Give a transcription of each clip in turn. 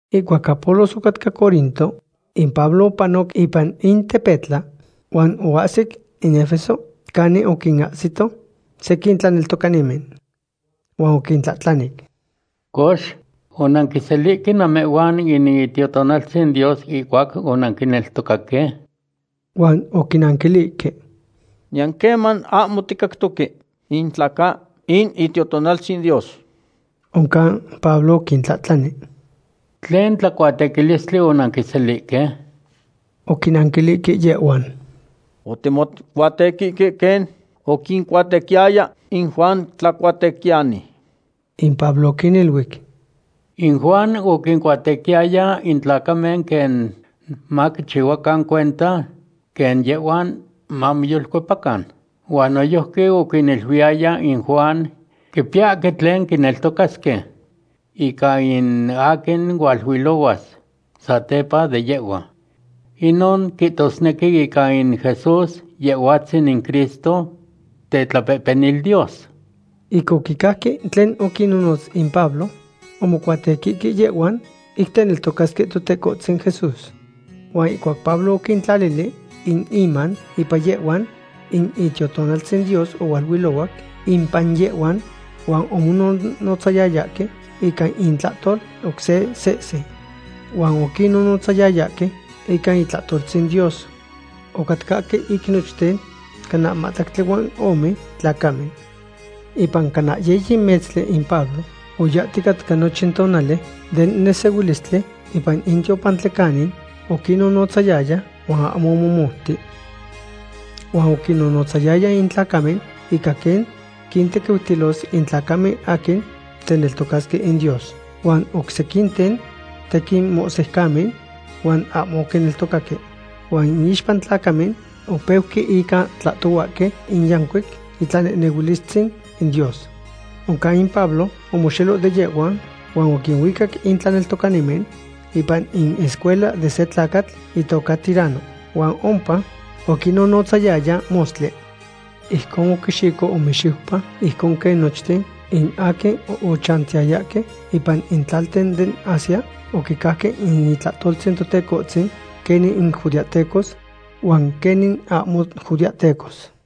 Ihcuac Apolos ocatca Corinto, in Pablo opanoc ipan in tepetla huan oahsic in Efeso, canin oquinahsihto sequin tlaneltocanimen. Huan oquintlahtlanic: ―Cox, ¿onanquiselihque namehhuan in Itiotonaltzin Dios ihcuac onanquineltocaque? Huan oquinanquilihque: ―Niyan queman ahmo ticactoque in tla ca in Itiotonaltzin Dios. Oncan Pablo oquintlahtlani: ―¿Tlen tlacuatequilistli onanquiselihque? Oquinanquilihque yehhuan: ―Otimocuatequihque quen oquincuatequiyaya in Juan Tlacuatequiyani. In Pablo oquiniluic: ―In Juan oquincuatequiyaya in tlacamen quen maquichihuacan cuenta quen yehhuan mamoyolcuepacan. Huan noyojqui oquiniluiyaya in Juan quipiyahque tlen quineltocasque ica in aquin hualuilohuas satepa de yehhua. Inon quihtosnequi ica in Jesús, Yehhuatzin in Cristo, tetlapehpenil Dios. Ic oquicajque tlen oquinonotz in Pablo, omocuatequihque yehhuan ic teneltocasque Totecohtzin Jesús. Huan ihcuac Pablo oquintlalili in iman ipan yehhuan, in Itiotonaltzin Dios ohualuilohuac impan yehhuan, huan omonohnotzayayahque ica intlahtol oc se sehse. Huan oquinnonotzayayahque ica itlahtoltzin Dios. Ocatcahque ic nochten cana mahtlactli huan ome tlacamen. Ipan cana yiyi metztli in Pablo oyahticatca nochin tonali den nesehuilistli ipan in tiopantli canin oquinnonotzayaya huan ahmo omomouti. Huan oquinnonotzayaya in tlacamen ica quen quintequiutilos in tlacamen aquin teneltocasque in Dios. Huan oc sequinten tequin mohsiucamen huan ahmo oquineltocaque. Huan iixpa in tlacamen opeuque ica tlahtohuahque in yancuic itlanehnehuilistzin in Dios. Oncan in Pablo omoxelo de yehhuan huan oquinuicac in tlaneltocanimen ipan in escuela de se tlacatl itoca Tiranno, huan ompa oquinnonotzayaya mostli. Ijcon oquixico ome xiupa, ijcon quen nochten in aquin ochantiyayahque ipan in tlalten den Asia oquicajque in itlahtoltzin Totecohtzin, quenin judeahtecos huan quenin ahmo judeahtecos.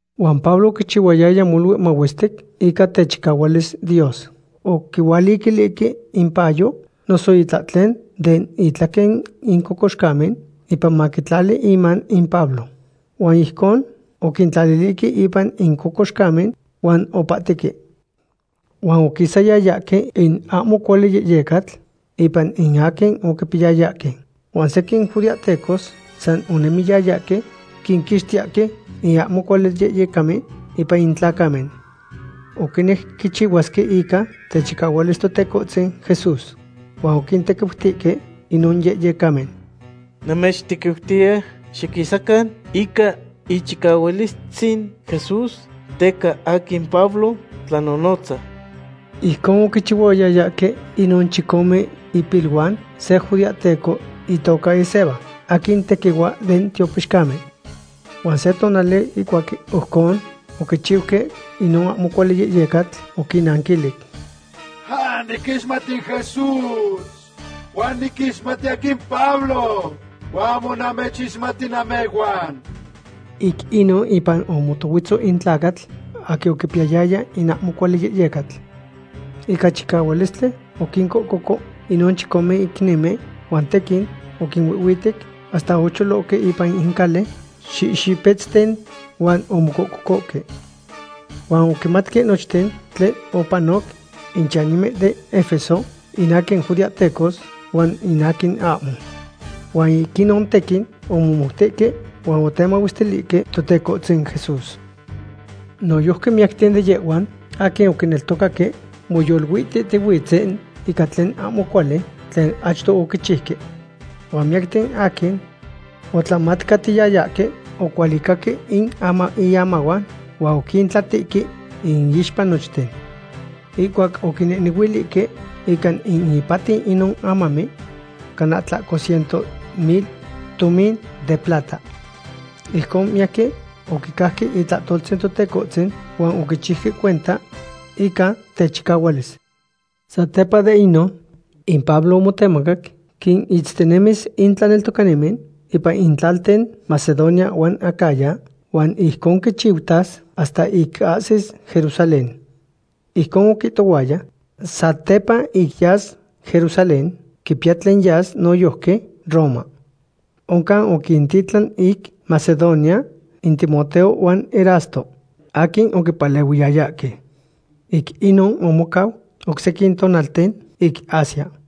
Huan Pablo oquichihuayaya molui mahuestic ica techicahualis Dios. Oquihualiquilihque impayo noso itlahtlen den itlaquen in cocoxcamen, ipan maquintlali iman in Pablo. Huan ijcon oquintlalilihque ipan in cocoxcamen huan opahtique. Huan oquisayayahque in ahmo cuali yehyecatl ipan in aquin oquipiyayahque. Huan sequin judeahtecos san onemiyayahque quinquixtiyahque in ahmo cuali yehyecamen ipan in tlacamen. Oquinejque quichihuasque ica techicahualis Totecohtzin Jesús. Huan oquintequiutihque inon yehyecamen: ―Namechtequiutiya xiquisacan ica ichicahualistzin Jesús teca aquin Pablo tlanonotza. Ijcon oquichihuayayahque inon chicome ipiluan se judeahteco itoca Esceva, aquin tequihua den tiopixcamen. Huan se tonali ihcuac ojcon oquichiuque, inon ahmo cuali yehyecatl oquinnanquilic: ―Niquixmati in Jesús, huan niquixmati aquin Pablo, huan ahmo namechixmati namehhuan. Ic inon impan omotohuetzo in tlacatl aquin oquipiyaya in ahmo cuali yeyecatl. Ica chicahualistli oquincohcoco inon chicome icnimen huan tequin oquinuihhuitec hasta ocholohque ipan in cali xihxipetzten huan omocohcohque. Huan oquimatque nochten tlen opanoc in chanimen den Efeso, in aquin judeahtecos huan in aquin ahmo. Huan ic inon tequin omomoutihque huan otemahuestilihque Totecohtzin Jesús. Noyojqui miyacten de yehhuan aquin oquineltocaque moyoluihtihtihuitzen ican tlen ahmo cuali tlen achto oquichiuque. Huan miyacten aquin otlamatcatiyayahque ocualicaque in iamahuan huan oquintlatihque iixpa nochten. Ihcuac oquinehnehuilihque ica in ipatiu inon amamen cana tlahco ciento mil tomin de plata. Ijcon miyaquin oquicajque itlahtoltzin Totecohtzin huan oquichiuque cuenta ica techicahualis. Satepa de inon, in Pablo omotemacac quinitztinemis in tlaneltocanimen ipan in tlalten Macedonia huan Acaya, huan ijcon quichiutas hasta ic ahsis Jerusalén. Ijcon oquihtohuaya, satepa ic yas Jerusalén quipiya tlen yas noyojqui Roma. Oncan oquintitlan ic Macedonia in Timoteo huan Erasto, aquin oquipalehuiyayahque. Ic inon omocau oc sequin tonalten ic Asia.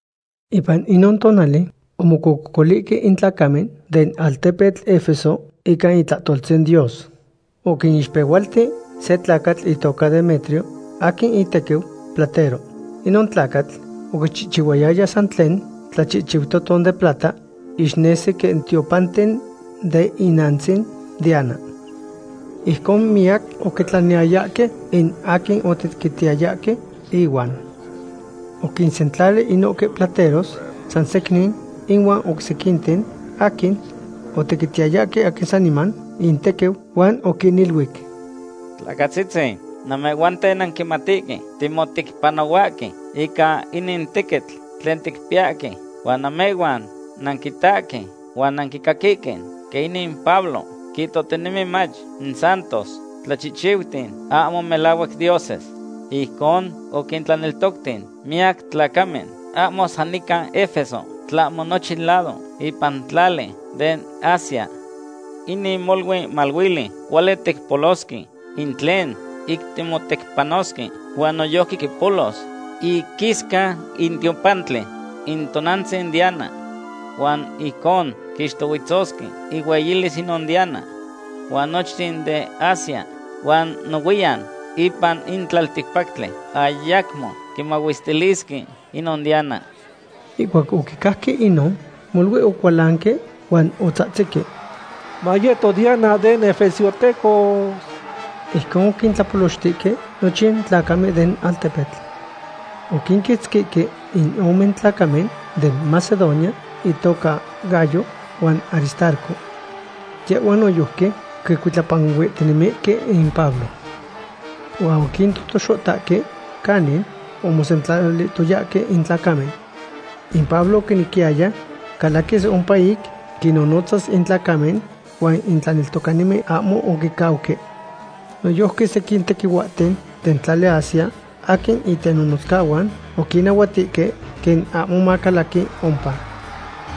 Ipan inon tonali omocococolihque in tlacamen den altepetl Efeso ica itlahtoltzin Dios. Oquinixpehualti se tlacatl itoca Demetrio, aquin itequiu platero. Inon tlacatl oquichihchihuayaya san tlen tlachihchiutoton de plata ixnesihque quen tiopanten den inantzin Diana. Ijcon miyac oquitlaniyayahque in aquin otequitiyayahque ihuan. Oquinsentlali inohque plateros san secnin ihuan oc sequinten aquin otequitiyayahque aquin saniman intequiu huan oquiniluic: ―Tlacatzitzin, namehhuanten nanquimatihque timotecpanohuahque ica inin tequitl tlen ticpiyahque. Huan namehhuan nanquitahque huan nanquicaquihque quen inin Pablo quihtohtinemi mach in santos tlachihchiuten ahmo melahuac dioses. Ijcon oquintlaneltocti miyac tlacamen ahmo san nican Efeso, tlahmo nochin lado ipan tlali den Asia. Inin molui maluili. Cuali ticpolosque in tlen ic timotecpanosque, huan noyojqui quipolos iquisca in tiopantli in tonantzin Diana, huan ijcon quixtohuetzosque ihueyilis inon Diana. Huan nochten den Asia huan nohuiyan ipan in tlalticpactli ayacmo quimahuestilisque inon Diana. Ihcuac oquicajque inon, molui ocualanque huan otzahtzihque: ―¡Mayeto Diana den efesiohtecos! Ijcon oquintlapolochtihque nochin tlacamen den altepetl. Oquinquitzquihque in ome tlacamen den Macedonia intoca Gayo huan Aristarco. Yehhuan noyojqui quicuitlapanuihtinemihque in Pablo. Huan oquintotoxotahque canin omosentlalihtoyahque in tlacamen. In Pablo oquinequiyaya calaquis ompa ic quinnonotzas in tlacamen, huan in tlaneltocanimen ahmo oquicauque. Noyojqui sequin tequihuahten den tlali Asia, aquin itenonotzcahuan, oquinahuatihque quen ahmo macalaqui ompa.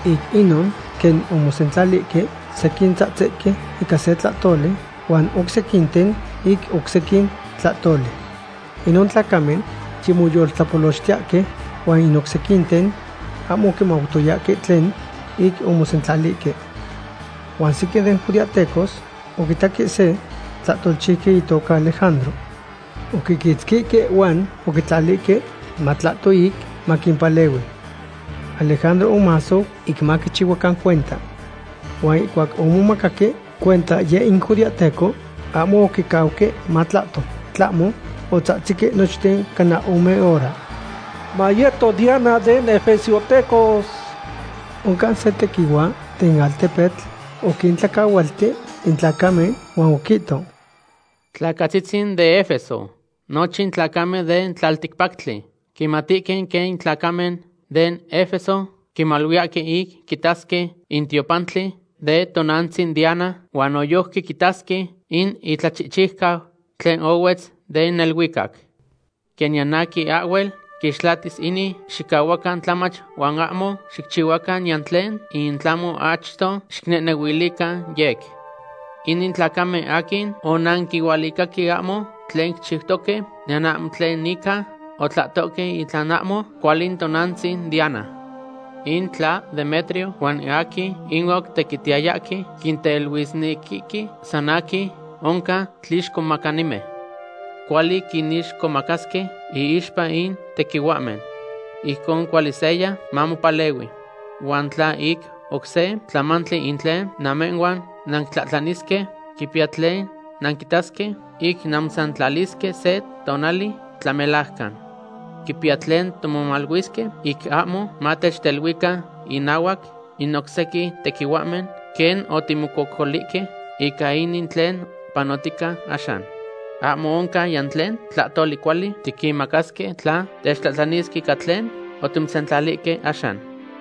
Ic inon, quen omosentlalihque, sequin tzahtzihque ica se tlahtoli huan oc sequinten ic oc sequin tlahtoli. Inon tlacamen yimotlapolochtiyahque huan in oc sequinten ahmo oquimautoyahque tlen ic omosentlalihque. Huan sequin den judeahtecos oquitaque se tlahtolchiuqui itoca Alejandro. Oquiquitzquihque huan oquitlalihque matlahto ic maquimpalehui. Alejandro omasou ic maquichihuacan cuenta. Huan ihcuac omomacaque cuenta yeh in judeahteco, ahmo oquicauque matlahto, tlahmo otzahtzihque nochten cana ome hora: ―¡Mayeto Diana den efesiohtecos! Oncan se tequihua den altepetl oquintlacahualti in tlacamen, huan oquihto: ―Tlacatzitzin den Efeso; nochin tlacamen den tlalticpactli quimatihque quen in tlacamen den Efeso quimaluiyahque ic quitasque in tiopantli de tonantzin Diana, huan noyojqui quitasque in itlachihchiucau tlen ohuetz den neluicac. Quen niyan aquin ahhuel quixtlatis inin, xicahuacan tlamach huan ahmo xicchihuacan niyan tlen, in tlahmo achto xinehnehuilican yec. Inin tlacamen aquin onanquinualicahque ahmo tlen quichiutoque, niyan ahmo tlen ica otlahtohque in tla ahmo cuali in tonantzin Diana. In tla Demetrio huan in aquin ihuan otequitiyayahque quinteluisnequihque san aquin, oncan tlixcomacanimen. Cuali quinixcomacasque iixpa in tequihuahmen. Ijcon cuali seya mamopalehui. Huan tla ic oc se tlamantli in tlen namehhuan nanquitlahtlanisque, quipiya tlen nanquitasque ic nanmosentlalisque se tonali tlamelajcan. Quipiya tlen timomaluisque ic ahmo matechteluican inahuac in oc sequin tequihuahmen, quen otimocococolihque ica inin tlen panotica axan. Ahmo oncan niyan tlen tlahtoli cuali tiquinmacasque tla techtlahtlanisque ica tlen otimosentlalihque axan.